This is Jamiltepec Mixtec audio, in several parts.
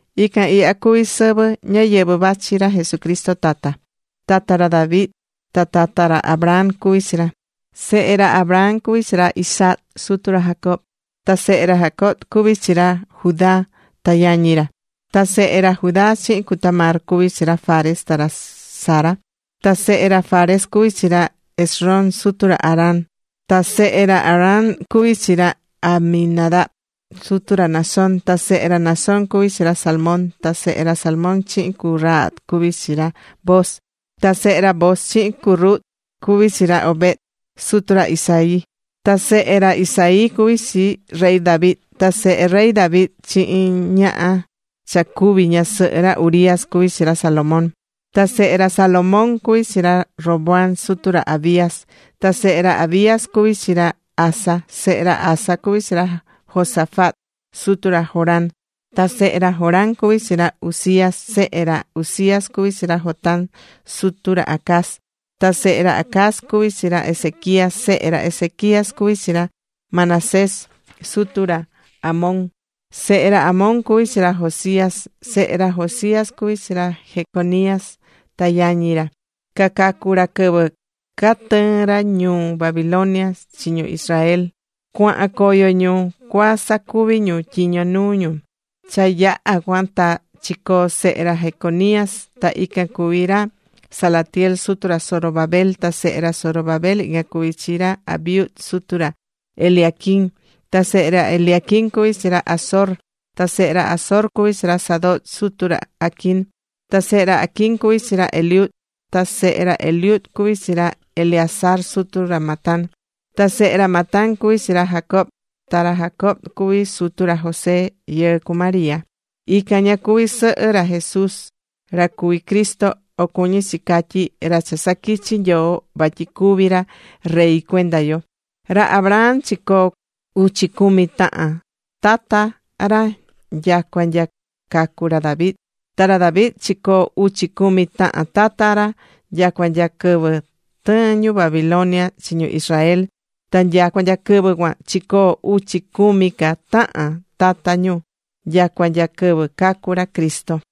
Ican ihya cuví sɨvɨ ñáyɨvɨ vachi ra Jesucristo tata. Tata ra David ta tata ra Abraham cuví chi ra. Sehe ra Abraham cuví chi ra Isaac, sutu ra Jacob. Ta sehe ra Jacob cuví chi ra Judá ta yañi ra. Ta sehe ra Judá chihin cu Tamar cuví chi ra Fares ta ra Zara. Ta sehe ra Fares cuví chi ra Esrom sutu ra Aram. Ta sehe ra Aram cuví chi ra Aminadab sutu ra Naasón. Ta sehe ra Naasón cuví chi ra Salmón. Ta sehe ra Salmón chihin cu Rahab cuví chi ra Booz. Ta sehe ra Booz chihin cu Rut cuví chi ra Obed, sutu ra Isaí. Ta sehe ra Isaí cuví chi rey David. Ta sehe rey David chihin ñaha cha cuvi̱ ñasɨhɨ ra Urías cuví chi ra Salomón. Ta sehe ra Salomón cuví chi ra Roboam sutu ra Abías. Ta sehe ra Abías cuví chi ra Aza. Sehe ra Aza cuví chi ra Josafat, sutu ra Joram. Ta sehe ra Joram cuví chi ra Uzías. Sehe ra Uzías cuví chi ra Jotam, sutu ra Acaz. Ta sehe ra Acaz cuví chi ra Ezequías. Sehe ra Ezequías cuví chi ra Manasés, sutu ra Amón. Sehe ra Amón cuví chi ra Josías. Sehe ra Josías cuví chi ra Jeconías ta yañi ra. Cacacu̱ ra quɨvɨ catɨɨ̱n ra ñuu Babilonia chi ñu Israel, cuahan coyo ñu cua sacuvi ñu tyiño nuu ñu. Cha yaha cuan, ta chicoo sehe ra Jeconías, ta ican cuví ra Salatiel sutu ra Zorobabel. Ta sehe ra Zorobabel ican cuví chi ra Abiud sutu ra Eliaquim. Ta sehe ra Eliaquim cuví chi ra Azor. Ta sehe ra Azor cuví chi ra Sadoc sutu ra Aquim. Ta sehe ra Aquim cuví chi ra Eliud. Ta sehe ra Eliud cuví chi ra Eleazar sutu ra Matán. Ta sehe ra Matán cuví chi ra Jacob. Ta ra Jacob cuví sutu ra José yɨɨ cu María. Ican ña cuví sɨhɨ ra Jesús ra cuví Cristo, o cuñí chi catyí, ra cha saquichi Nyoo vatyi cuví ra rey cuenda yo. Ra Abraham chicoo̱ uchi cumi tahan tata ra nyacua nya cacu̱ ra David. Ta ra David chicoo̱ uchi cumi tahan tata ra nyacua nya quɨvɨ tɨɨ̱n ñu Babilonia chi ñu Israel. Ta nyacua nya quɨvɨ cuan chicoo̱ uchi cumi ca tahan tata ñu nyacua nya quɨvɨ cacu̱ ra Cristo.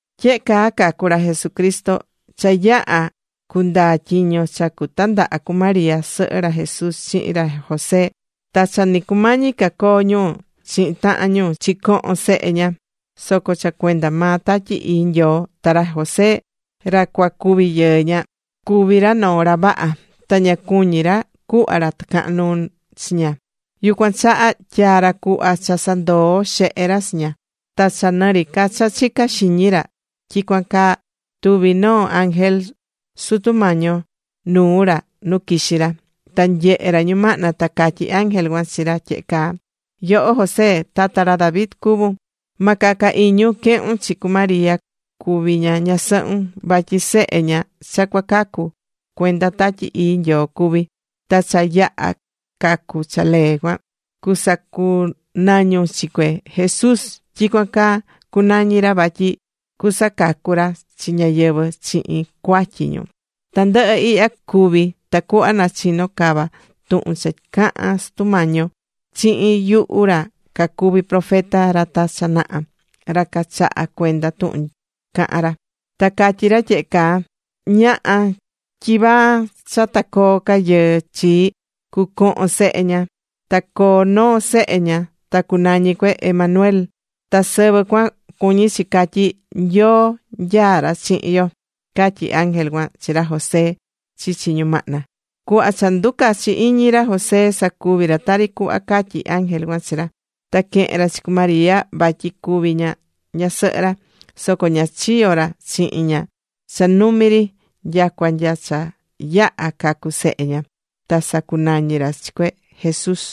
Tyehe caa cacu̱ ra Jesucristo: Cha yaha̱ cundaa tyiño cha cutandaha cu María, sɨhɨ ra Jesús, chihin ra José. Ta cha ni cumañi ca coo ñu chihin tahan ñu, chicoho̱n sehe ña, soco cha cuenda maa Tatyi Ii Nyoo. Ta ra José ra cua cuvi yɨɨ ña, cuví ra noo ra vaha. Ta ña cuñí ra cuhva ra tɨcahan nuu chi ña, yucuan chaha tyaa̱ ra cuhva cha sandoo xehe ra chi ña. Ta cha nɨ ri ca cha chicá xiñi ra tyicuan caa, tuvi̱ noo ángel Sutu Mañi yo nuu ra nu quixí ra. Ta nyehe̱ ra ñumahna ta catyí ángel cuan chi ra tyehe caa: ―Yoho José, tata ra David cuvún. Ma caca iñun quehun chi cu María cuvi ña ñasɨhun, vatyi sehe ña cha cua cacu, cuenda Tatyi Ii Nyoo cuví. Ta cha yaha cacu cha lee cuan, cusacunañun chi cue: Jesús. Tyicuan caa cunañi ra vatyi cusacacu ra chi ñáyɨvɨ chihin cuatyi ñu. Tandɨhɨ ihya cuvi̱ tacuhva nachino cava tuhun cha caha̱n Sutu Mañi yo chihin yuhu ra cacuvi̱ profeta ra ta cha naha, ra cachahá cuenda tuhun cahán ra. Ta catyi̱ ra tyehe caa: Ñaha tyivaa cha ta coo ca rayɨɨ chi, cucohon sehe ña. Ta coo noo sehe ña. Ta cunañi cue: Emanuel. Ta sɨvɨ cuan cuñí chi catyí: “Nyoo nyaá ra chihin yo.” Catyí ángel cuan chi ra José chichi ñumahna. Cuhva cha nducachi̱ iñi ra José, sacuvi̱ ra tari cuhva catyi̱ ángel cuan chi ra. Ta quehe̱n ra chi cu María vatyi cuvi ña ñasɨhɨ ra. Soco ña chiyo̱ ra chihin ña cha numi ri. Nyacua nya cha yaha̱ cacu̱ sehe ña. Ta sacunañi̱ ra chi cue: Jesús.